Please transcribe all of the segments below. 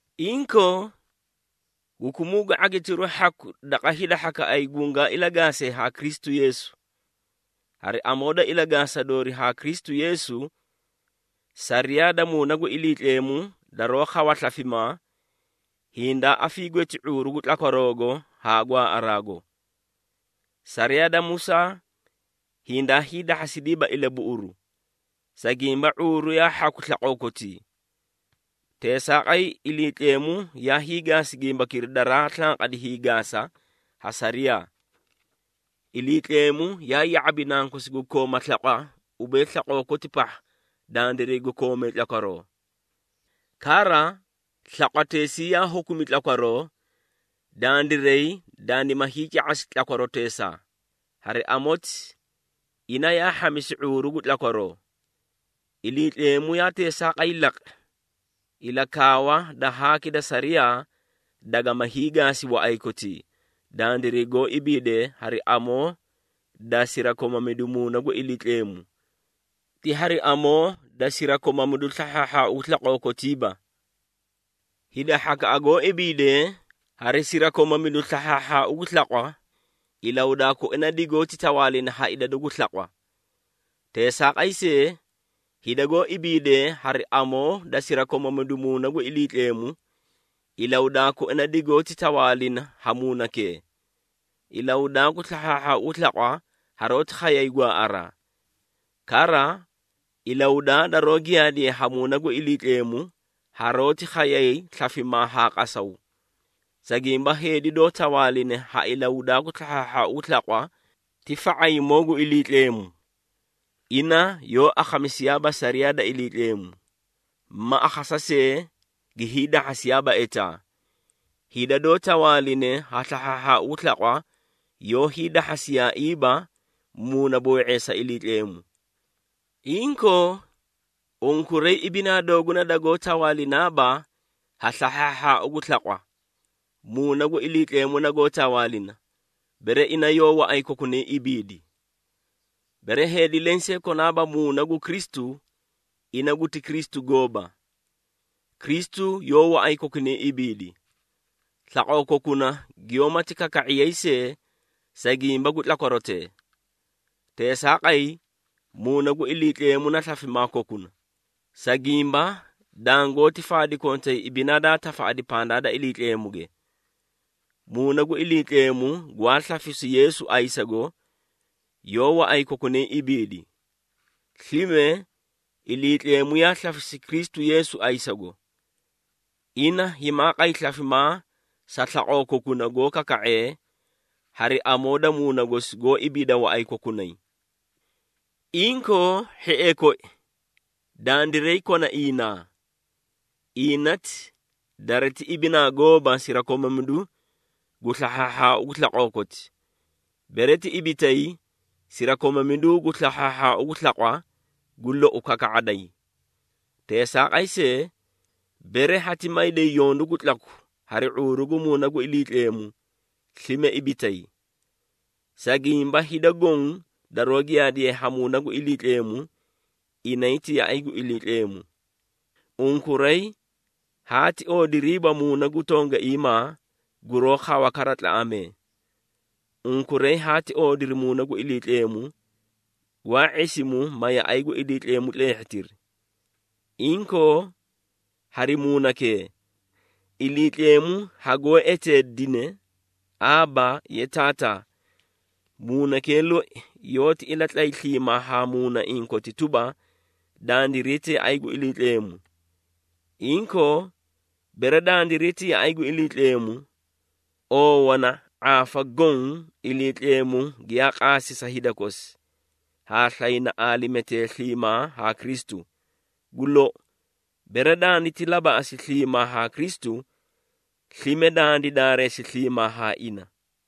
Inkoo, hukumuu gu ⁄agitiru hhaku daqa hida hhakaꞌay gungaa ilagaasee haa Kristu Yeesu. Hari amoo da ilagaasa doori haa Kristu Yeesu, sariyaa da Muuna gu Iliitleemu daroó khawa slafimaa, hindaa afiigweti ⁄uuru gu tlakwaroogo haa gwaaꞌaraago. Sariyaa da Musaa hindaa hiidahhasidiiba ilabuꞌuru, sa gimba ⁄uuru yaa hhaku slaqoo kotii. Teesaaqay Iliitleemu yaa hiigaasi gimbakira daraa slanqadi hiigaasa ha sariyaa. Iliitleemu yaa ya⁄abi Nankosi gu kooma slaqwa ubee slaqoo koti pahha dandiray gu koomee tlakwaroo. Kara, slaqwateesii yaa hukumi tlakwaroo, dandiray dandima hiica⁄asi tlakwaroteesaa. Hari amoti, ina yaa hhamisi ⁄uuru gu tlakwaroo. Iliitleemu yaa teesaaqay laqi, ilakaawa da haaki da sariyaa dagama hiigaasi waꞌay kotii, dandiray goó ibiidee hari amoo da sirakomamidu Muuna gu Iliitleemu, ti hari amoo da sirakomamidu slahhaahhaau gu slaqoo kotiiba. Hida hhakaꞌa goó ibiidee, hari sirakomamidu slahhaahhaau gu slaqwa, ilahudaa koina digoóti tawaalina ha idadu gu slaqwa. Teesaaqay see, hida goó ibiidee hari amoo da sirakomamidu Muuna gu Iliitleemu, ilahudaa koina digoóti tawaalina ha Muunakee. Ilahudaa gu slahhaahhaau gu slaqwa haroóti khayay gwaaꞌaraa. Kara, ilahudaa daroó giyaadiye ha Muuna gu Iliitleemu haroóti khayay slafimaa haa qasaw. Sa gimba heedi doó tawaaline ha ilahudaa gu slahhaahhaau gu slaqwa ti fa⁄ayimoo gu Iliitleemu. Ina yoó akhamisiyaaba sariyaa da Iliitleemu ma akhasa see gi hiidahhasiyaaba etaa. Hida doó tawaaline ha slahhaahhaau gu slaqwa, yoó hiidahhasiyaaiiba muunaboo⁄eesa Iliitleemu. Inkoo, unkuray ibinaa dooguna dagoó tawaalinaaba ha slahhaahhaau gu slaqwa, Muuna gu Iliitleemu nagoó tawaalina, bere ina yoó waꞌay kokunay ibiidi. Bere heedi lensee konaaba Muuna gu Kristu, ina guti Kristu gooba. Kristu yoó waꞌay kokunay ibiidi, slaqoo kokuna giyoómati kaka⁄iyay see, sa gimba gu tlakwarotee. Teesaaqay, Muuna gu Iliitleemu na slafimaa kokuna, sa gimba dangoóti faadi kontay ibinaa daa tafaꞌadi pandaa da Iliitleemuge. Muuna gu Iliitleemu gwaa slafisu Yeesu ayisago, yoó waꞌay kokunay ibiidi. Slime, Iliitleemu yaa slafisi Kristu Yeesu ayisago. Ina himaa qay slafimaa sa slaqoo kokuna goó kaka⁄ee hari amoo da Muuna gosi goó ibiida waꞌay kokunay. Inkoo, hhiee koi, dandiray kona iinaa. Iinati dariti ibinaa gooba sirakomamidu gu slahhaahhaau gu slaqoo koti. Bere ti ibitay, sirakomamidu gu slahhaahhaau gu slaqwa, gu lou kaka⁄aday. Teesaaqay see, bere hati mayday yondu gu tlaku hari ⁄uuru gu Muuna gu Iliitleemu, slime ibitay. Sa gimba hida goõ daroó giyaadiye ha Muuna gu Iliitleemu, inay ti yaꞌay gu Iliitleemu. Unkuray haati oodiriiba muuna gu tongaiimaa, guroó khawa kara tlaꞌamee. Unkuray haati oodiri Muuna gu Iliitleemu, gwaa ⁄isimu, ma yaꞌay gu Iliitleemu tleehhitiri. Inkoo, hari Muunakee, Iliitleemu hagoó eteedine, “Aaba, ye Taataa!” Muunakee loi yoóti ilatlay sliimaa haa muunaiĩ koti tuba, dandiray ti yaꞌay gu Iliitleemu. Inkoo, bere dandiray ti yaꞌay gu Iliitleemu, oowana ⁄aafa goõ Iliitleemu giyaa qaasi sa hida kosi, haa slayna aalimetee sliimaa haa Kristu. Gu lou, bere danditi labaꞌasi sliimaa haa Kristu, slime dandi daareesi sliimaa haa ina.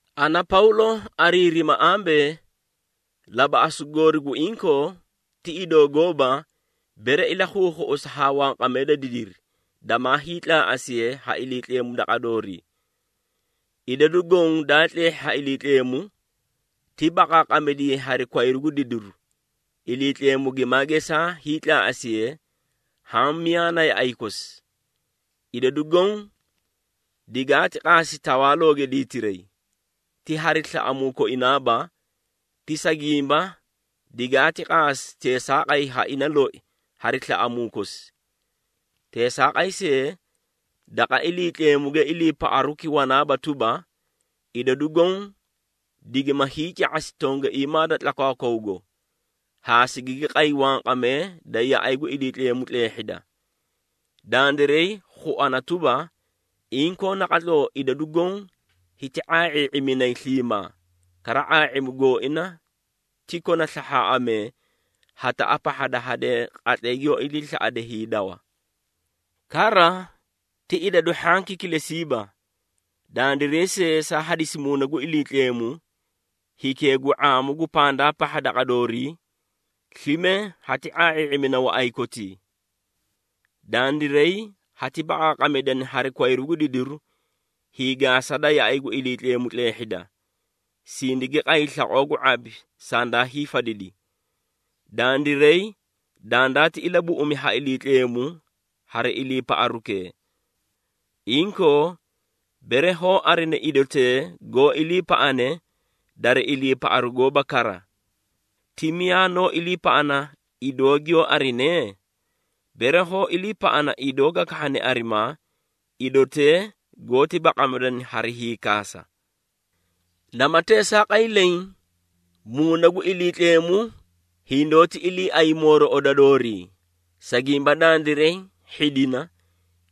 Ana, Pawlo ariirima ambee, labaꞌasu goori gu inkoo, ti idoo gooba, bere ilakhuukhuꞌusa haa wanqamee da didiri, damaa hiitlaaꞌasiye ha Iliitleemu daqa doorii. Idadu goõ daa tleehhi ha Iliitleemu, ti baqaaqamidiyayi hari kwayru gu didiru, Iliitleemu gimaa geesa hiitlaaꞌasiye haã miyaa na yaꞌay kosi. Idadu goõ digaati qaasi tawaalooge diitiray, ti hari slaꞌamuu koinaaba, ti sa gimba digaati qaasi teesaaqay ha ina loi hari slaꞌamuu kosi. Teesaaqay see, daqa Iliitleemuge iliipaꞌaruki wana tuba, idadu goõ digima hiica⁄asi tongaiimaa da tlakwaakwawgo, haa sigigi qay wanqamee da yaꞌay gu Iliitleemu tleehhida. Dandiray khuana tuba, inkoo naqatloo idadu goõ hiti ⁄aa⁄ii⁄iminay sliimaa, kara ⁄aa⁄imu gooina ti kona slahhaaꞌamee hataꞌa pahha da hadee qatlay giyoó iliislaꞌade hiidawa. Kara, ti idadu hhanki kilesiiba, dandiray see saa hadisi Muuna gu Iliitleemu, hikee gu ⁄aamu gu pandaa pahha daqa doorii, slime hati ⁄aa⁄ii⁄imina waꞌay kotii. Dandiray hati baqaaqamidana hari kwayru gu didiru, hiigaasa da yaꞌay gu Iliitleemu tleehhida, sindigi qay slaqoo gu ⁄abi sandaa hiifadidi. Dandiray dandaati ilabuꞌumi ha Iliitleemu hari iliipaꞌarukee. Inkoo, bere hoó arina idotee goó iliipaꞌane dari iliipaꞌaru gooba kara. Ti miyaa noó iliipaꞌana idoo giyoó arine? Bere hoó iliipaꞌana idoo ga kahhane arimaa, idotee goóti baqamidana hari hiikaasa. Nama teesaaqay leẽ, Muuna gu Iliitleemu hindoóti iliiay mooroꞌoda doorii, sa gimba dandiray hhidina,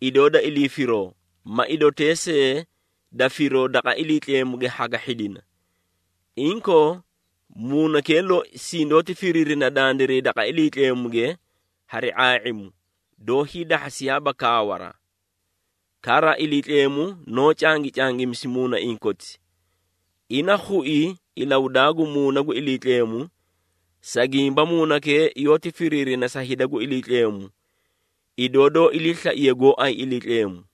idoo da ilii firoo ma idotee see da firoo daqa Iliitleemuge haga hhidina. Inkoo, Muunakee loi sindoóti firiirina dandiray daqa Iliitleemuge hari ⁄aa⁄imu, doó hiidahhasiyaaba kaawaraa. Kara, Iliitleemu noó cangicangimisi muunaiĩ koti. Ina khui ilahudaa gu Muuna gu Iliitleemu, sa gimba Muunakee yoóti firiirina sa hida gu Iliitleemu, idoo doó iliislaiye gooay Iliitleemu.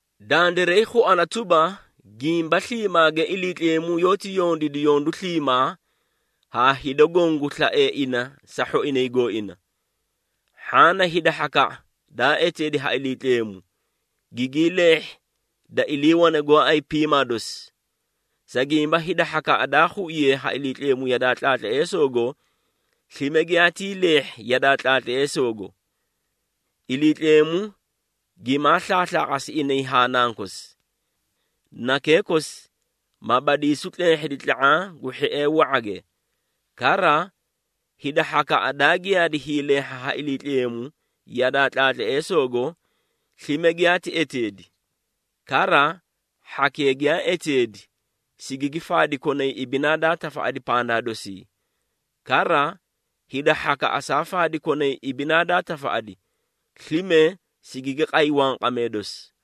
Dandiray khuana tuba, gimba sliimaage Iliitleemu yoóti yondiidi yondu sliimaa haa hida goõ gu slaee ina sa hhoinay gooina. Hhaã na hida hhakaꞌa daa eteedi ha Iliitleemu, gigii leehhi da iliiwane gooay piimaa dosii. Sa gimba hida hhakaꞌa daa khuiye ha Iliitleemu yadaa tlaatleesoogo, slime giyaatii leehhi yadaa tlaatleesoogo. Iliitleemu gimaa slaaslaaqasi inay haa Nankosi. Nakee kosi, ma badiisu tleehhidi tla⁄aã gu hhiee wa⁄age. Kara, hida hhakaꞌa daa giyaadi hiileehha ha Iliitleemu yadaa tlaatleesoogo, slime giyaati eteedi. Kara, hhakee giyaa eteedi, sigigi faadi konay ibinaa daa tafaꞌadi pandaa dosii. Kara, hida hhakaꞌa saa faadi konay ibinaa daa tafaꞌadi, slime sigigi qay wanqamee dosi.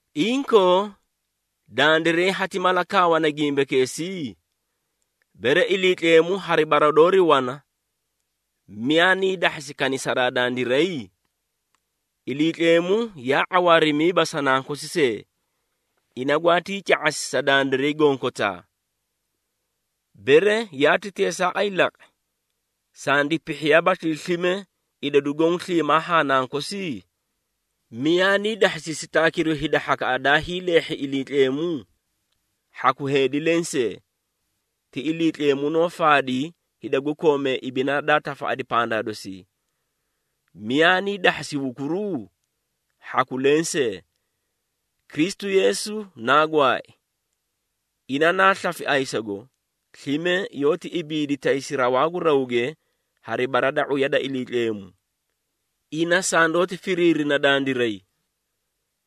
Inkoo, dandiray hati mala kaawana gimbakeesii? Bere Iliitleemu hari bara doori wana, miyaa nii dahhasi kanisaraa dandiray? Iliitleemu yaa ⁄awaarimiiba sa Nankosi see, ina gwaatii ca⁄asi sa dandiray gonkotaa. Bere yaati teesaaqay laqi, sandi pihhiyaabaslii slime idadu goõ sliimaa haa Nankosi? Miyaa nii dahhasi sitaakiru hida hhakaꞌa daa hiileehhi ha Iliitleemu? Hhaku heedi lensee! Ti Iliitleemu noó faadi hida gu koomee ibinaa daa tafaꞌadi pandaa dosii. Miyaa nii dahhasi hukuruu? Hhaku lensee! Kristu Yeesu naa gwaai. Ina naa slafi ayisago, slime yoóti ibiidi taysi rawaa gu rawge hari bara da ⁄uya da Iliitleemu. Ina sandoóti firiirina dandiray.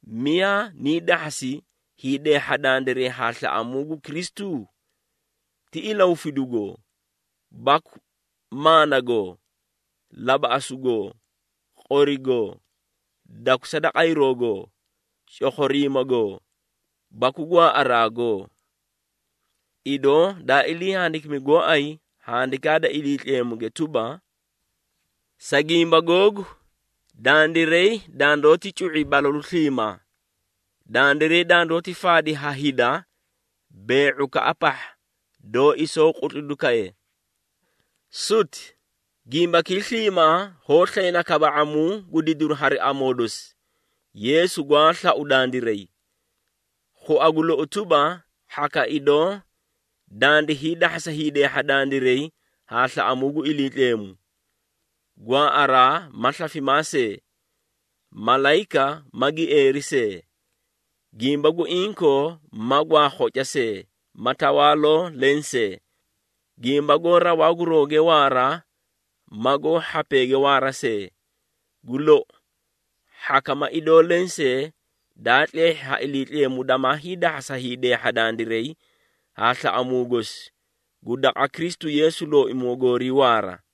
Miyaa nii dahhasi hiideehha dandiray haa slaꞌamuu gu Kristu? Ti ilahufidugoo, baku maanagoo, labaꞌasugoo, qorigoo, dakusa da qayrogoo, cokhoriimagoo, baku gwaaꞌaraagoo? Idoo daa ilii handikimi gooay Handikaa da Iliitleemuge tuba, “Sa gimba googu, dandiray dandoóti cu⁄i balalu sliimaa. Dandiray dandoóti faadi ha hida bee⁄ukaꞌa pahha doó isoo qutlidu kaye.” Suti! Gimbakii sliimaa hoó slayna kaba⁄amuu gu didiru hari amoo dosi, Yeesu gwaa slau dandiray. Khua gu lou tuba, hhaka idoo dandi hiidahhasa hiideehha dandiray haa slaꞌamuu gu Iliitleemu. Gwaaꞌaraa ma slafimaa see, malayika ma gieeri see, gimba gu inkoo ma gwaa khoca see, ma tawaaloo lensee, gimba goó rawaa gu rawge waara ma goó hhapeege waara see. Gu lou, hhaka ma idoo lensee daa tleehhi ha Iliitleemu damaa hiidahhasa hiideehha dandiray haa slaꞌamuu gosi gu daqa Kristu Yeesu Looimoo goorii waara.